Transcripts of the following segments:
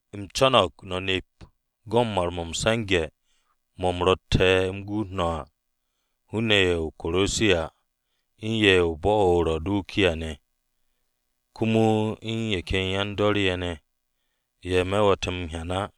U̱m co̱no̱g no̱ nep go̱n mar-mo̱ m-se̱nge̱ mo̱ u̱m ro̱tte̱ remen u̱m guut no̱ à, hun-ne̱ ye̱ o-Korosiya u̱n ye̱ u̱n bo̱-o̱ o-Rawudikiya ne̱, komo u̱n ye̱ ken yan-dor ye̱ ne̱ ye̱ we̱te̱ me̱ m-hyan á.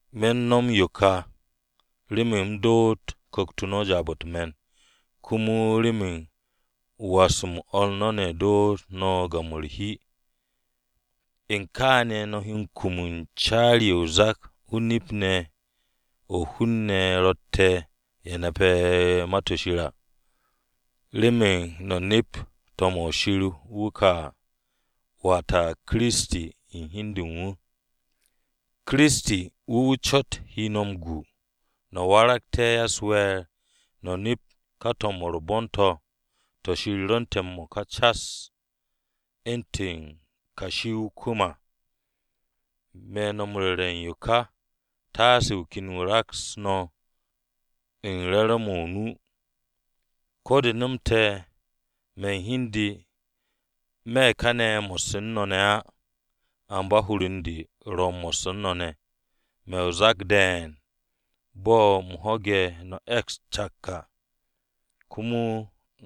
Me̱ m-no̱m u̱n yo ka remen u̱m dooté̱ ku̱kt-o no̱ jaab-o̱ u̱t-me̱n, komo remen was-m o̱r no̱ ne̱ dootú̱ no̱ gam-o̱ u̱r-hi. U̱n kaane̱ no̱ he kum u̱n caari-o̱ o-zak o-nip ne̱ o̱ hun-ne̱ rotte̱ ye̱ nape̱ Ma-to̱ Shir à, remen no̱ nept to̱m-o̱ Shir wuke̱ à, wata, Kiristi u̱n hi u̱n de u̱n wu̱. Kiristi, wu̱ wu̱ cot he no̱ m-gu no̱ waragte̱ ya-u̱s-we̱e̱r no̱ nept ka to̱m-o̱ u̱r-bon to̱, to̱ Shir rwu̱nte̱ m-mo̱ka cas to̱ ro̱ u̱ntu̱n kashi o-kwu̱m à. Me̱ no̱ m-ru̱re̱ u̱n yo ka taase wu̱ ken wu̱ raks no̱ u̱n re̱re̱m-mo̱ o-nu. Ko̱ de nomte̱ me̱ u̱n hi u̱n de me̱ kane̱ mo̱sse̱ u̱n no̱ ne̱ á, amba hur u̱n de ro̱ mo̱sse̱ u̱n no̱ ne̱. Me̱ o-zak de̱e̱n bo̱ u̱m ho̱ge̱ no̱ e̱ks cak à, komo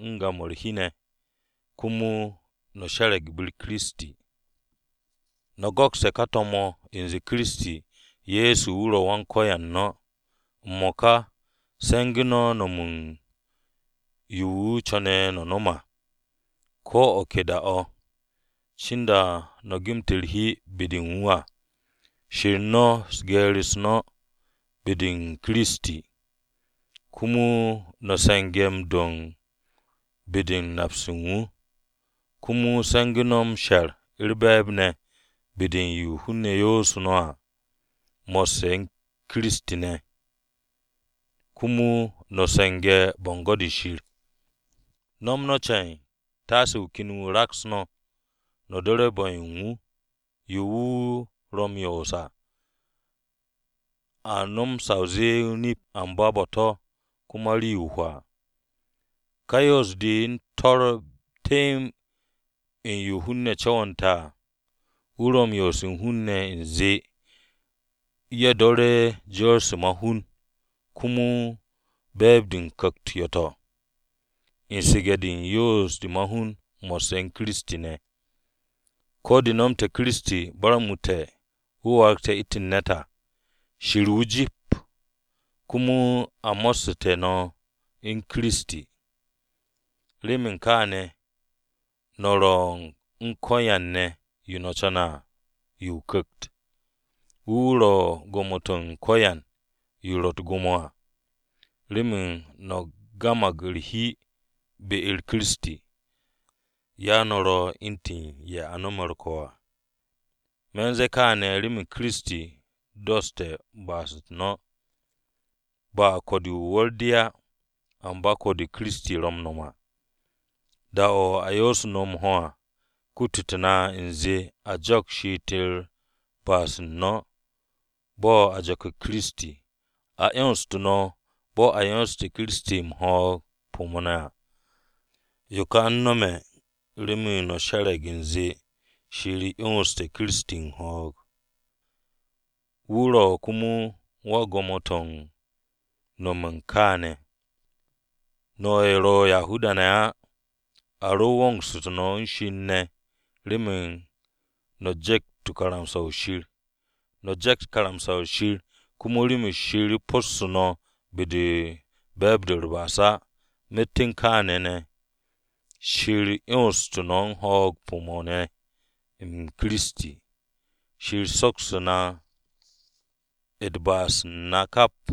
u̱n gam-o̱ u̱r-hi ne̱. Komo no̱ she̱re̱g be-u̱r Kiristi. No̱ go̱kste̱ ka to̱m-o̱ u̱nze Kiristi Ye̱so wu̱ ro̱ Wan-Ko̱yan no̱. M-mo̱ka se̱ngu̱ no̱ no̱m u̱n yo wu̱ co̱ne̱ no̱ no̱m à, ko̱ o̱ ke da-o̱ cinda no̱ gemte̱ u̱r-hi be-de u̱n wu̱ à. She̱r no̱ geer-u̱s no̱ n-me̱ u̱n Kiristi, komo no̱ se̱nge̱ m-do̱ be-de u̱n nap-se u̱n wu̱. Komo se̱ngu̱ no̱ m-she̱r u̱r-be̱e̱b ne̱ be-de u̱n yo hun-ne̱ yoosu̱ no̱ à mo̱sse̱ u̱n Kiristi ne̱ à. Komo no̱ se̱nge̱ bo̱ngo̱n-de Shir. No̱m no̱ ceen! Taase wu̱ ken wu̱ raks no̱, no̱ do̱re̱ bu̱-yo u̱n wu̱ á. Yo ye̱ ro̱ m-yoos à, a nom sa o zee o-nip, amba bo̱-to̱ komo rii-yo o-hwaa. Ka yoos-de u̱n to̱r temb u̱n yo hun-ne̱ co̱wo̱nte̱ à. Ye̱ ro̱ m-yoose̱ u̱n hun-ne̱, u̱nze ye̱ m-do̱re̱ u̱n jor-se ma-hun komo be̱e̱b-de ku̱kt-u̱t yo̱-to̱, u̱n su̱ge̱-de u̱n yoose̱ u̱n hun-ne̱ mo̱sse̱ u̱n Kiristi ne̱. Ko̱ de nomte̱ Kiristi barmu̱te̱ wu̱ warag u̱ntu̱n hun-ne̱ à, wu̱ Shir wu̱ jip. Komo a mo̱ssu̱te̱ no̱ u̱n Kiristi, remen kaane̱ no̱ ro̱ u̱n ko̱yan ne̱, yo no̱ co̱ne̱ à yo o-Ku̱kt. Wu̱ wu̱ ro̱ u̱n gwo̱mo-to̱ u̱n ko̱yan yo ro̱ u̱t-gwo̱mo à. Remen no̱ gamag u̱r-hi be-u̱r Kiristi, ya no̱ ro̱ u̱ntu̱n ye̱ a nome̱ u̱r-ko̱ à. Me̱ u̱n ze̱e̱ kaane̱ remen Kiristi doste̱ ba'as-u̱t no̱. Ba ko̱-de o-wu̱r de á, amba ko̱-de Kiristi ro̱ m-no̱m à. Da-o̱ a yo'osu̱ no̱ m-ho̱ à, kutute̱ na u̱nze a jo̱k she'et-de u̱n ba'as-u̱t no̱ bo̱ a jo̱ke̱ Kiristi à. A 'yonstu̱ no̱ bo̱ a 'yonse̱ Kiristi u̱n ho̱o̱g-m pu̱-mo̱ à. Yo ka u̱n nome̱ remen no̱ she̱re̱g u̱nze Shir ye̱ 'yonse̱ Kiristi u̱n ho̱o̱g, wu̱ ro̱ komo u̱n gwo̱mo-to̱ u̱n no̱m u̱n kaane̱ ne̱. No̱ ye̱ ro̱ Yahuda-ne̱ á, a ro wongsu̱tu̱ no̱ u̱n Shir ne̱ remen no̱ je̱kt karamsa-o̱ Shir. No̱ je̱kt karamsa-o̱ Shir, komo remen Shir possu̱tu̱ no̱ be-de u̱n be̱e̱b-de u̱t-ba'as á. Myet u̱n kaane̱ ne̱ Shir 'yonstu̱ no̱ u̱n ho̱o̱g-m pu̱-mo̱ ne̱ u̱n Kiristi, Shir soksu̱tu̱ na ba'as-u̱t na kap.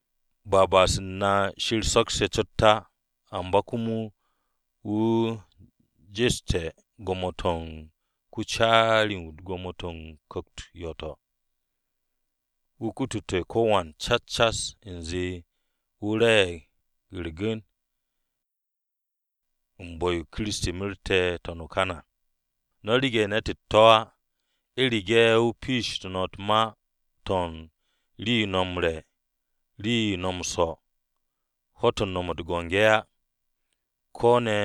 Ba ba'as-u̱t na Shir sokse̱ cot á amba komo wu̱ jeste̱ gwo̱mo-to̱ u̱n ko-caari-wu̱ u̱n gwo̱mo-to̱ u̱t-ku̱kt yo̱-to̱. Wu̱ kutute̱ ko̱wan cas cas u̱nze wu̱ re̱e̱g ye̱ u̱r-gu̱n u̱n bu̱-yo Kiristi merte̱ n-to̱n o-kan à. No̱ rege̱ ne̱t u̱t-to̱ á, u̱rege̱ wu̱ piishitu̱ no̱ u̱t-ma to̱ u̱n: Rii-yo no̱ m-re̱, Rii-yo no̱ m-swo̱, Ho̱-to̱ no̱ no̱m u̱t-biki á, Ko̱ ne̱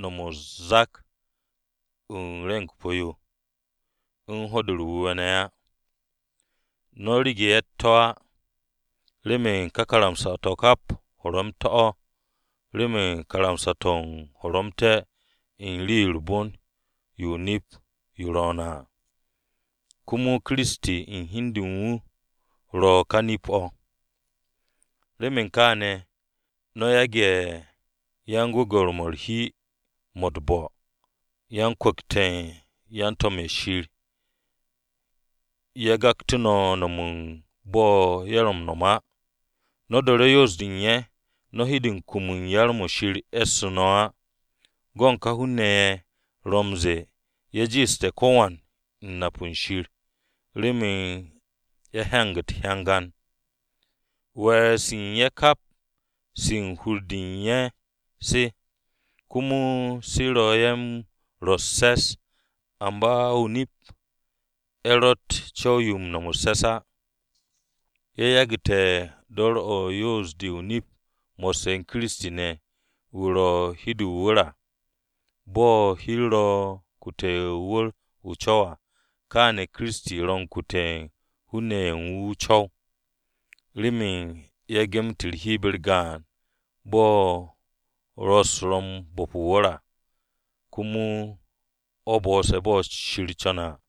no̱m o-zak u̱n re̱ng-o pu̱-yo, u̱n Ho̱-de u̱r-Wu̱we̱ ne̱ á. No̱ rege̱ ye̱ u̱t-to̱ á, remen ká karamsa-to̱ kap horomte̱-o̱. Remen karamsa-to̱ to̱ horomte̱-o̱ u̱n rii-yo u̱r-bon yo o-nip yo rwo̱o̱ne̱ à. Komo Kiristi u̱n hi u̱n de u̱n wu̱ ro̱ ka nip-o̱. Remen kaane̱ no̱ yage̱ yan-gwe̱gwe̱r-mo̱ u̱r-hi mo̱ u̱t-bo̱, u̱n yan-kwu̱kte̱ u̱n yan-to̱m-ye̱ Shir ne̱ gaktu̱ no̱ no̱m bo̱ ye̱ ro̱ m-no̱m á. No̱ do̱re̱ yoos-de u̱n ye̱ no̱ he de kumu u̱n yar-mo̱ Shir e̱ssu̱ no̱ á. Go̱n ka hun-ne̱ ye̱ ro m-ze̱e̱ ye̱ jiishte̱ ko̱wan u̱n nap u̱n Shir remen ye̱ hyanag u̱t-hyangan. We̱e̱r-se u̱n wu̱ kap se u̱n hur-de u̱n wu̱ se, komo se ro̱ wu̱ m-rwo̱ u̱s-se̱s. Amba o-nip wu̱ ro̱tt co̱w-yo u̱n no̱m u̱s-se̱s á. Wu̱ yagu̱su̱te̱ dor-o̱ u̱n yoos-de o-nip mo̱sse̱ u̱n Kiristi ne̱, wu̱ ro̱ hi-de o-wu̱r à. Bo̱ hi-u̱r ro̱ m-kute̱ o-wu̱r o-co̱w à, kaane̱ Kiristi ro̱ m-kute̱ u̱n hun-ne̱ ye̱ u̱n wu̱ o-co̱w, remen ye̱ gemet u̱r-hi be-u̱r gaan bo̱ rwo̱-u̱s ro̱ m-bo̱p o-wu̱r à. Komo o̱ bo̱'o̱se̱ bo̱ Shir co̱ne̱ à.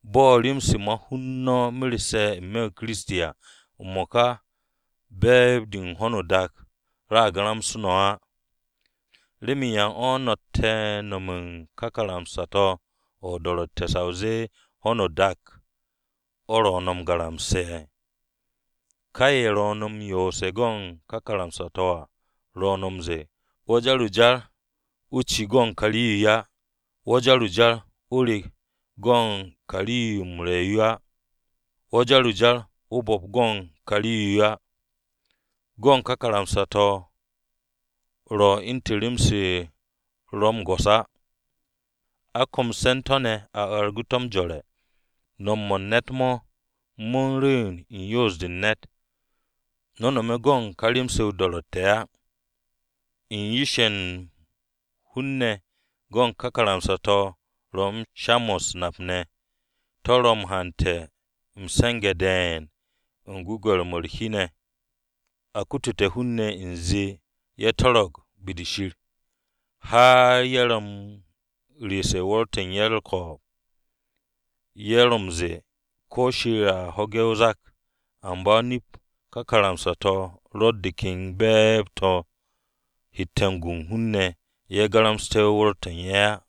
Bo̱ rem-se ma-hun no̱ merse̱ n-me̱ u̱n Kiristi à, m-mo̱ka be̱e̱b-de u̱n ho̱no o-dak, a garamse̱ no̱ á. ¿Remen yan o̱ no̱tte̱ u̱n nome̱ u̱n ka karamsa-to̱ o-do̱ro̱tte̱ sa o zee ho̱no o-dak o̱ ro̱ no̱ m-garamse̱? Ka ye̱ ro̱ no̱ m-yoose̱ u̱n ka karamsa-to̱ à, ro̱ no̱ m-ze̱e̱, “Wo̱ jar o-jar o ci go̱n ka rii-yo á! Wo̱ jar o-jar o rek go̱n ka rii-yo m-re̱ yo á! Wo̱ jar o-jar o bu̱p go̱n ka rii-yo á!” Go̱n ka karamsa-to̱ ro̱ u̱ntu̱n rem-se ro̱ m-go̱s á. A komse̱ u̱n to̱ ne̱ a argu̱ to̱ m-jore̱. No̱m mo̱ u̱n ne̱t-mo̱, mo̱ u̱n rwu̱u̱n u̱n yoos-de u̱n ne̱t. No̱ nome̱ go̱n ka rem-se o-do̱ro̱tte̱ á. U̱n yish-ye̱ u̱n hun-ne̱, go̱n ka karamsa-to̱ ro̱ u̱n sha-mo̱ u̱s-nap ne̱, to̱ ro̱ m-hante̱ m-se̱nge̱ de̱e̱n u̱n gwu̱gwe̱r-mo̱ u̱r-hi ne̱ a kutute̱ hun-ne̱ u̱nze ye̱ to̱ro̱g be-de Shir. Har ye̱ ro̱ u̱n reese̱ u̱n wu̱r-to̱ u̱n ye̱ u̱r-ko̱o̱b. Ye̱ ro̱ m-ze̱e̱ ko̱ Shir a ho̱ge̱ o-zak. Amba o-nip ka karamsa-to̱ ro̱tt de ken be̱e̱b-de to̱ hette̱ gu u̱n hun-ne̱ ye̱ garamsu̱te̱ wu̱r-to̱ u̱n ye̱ á.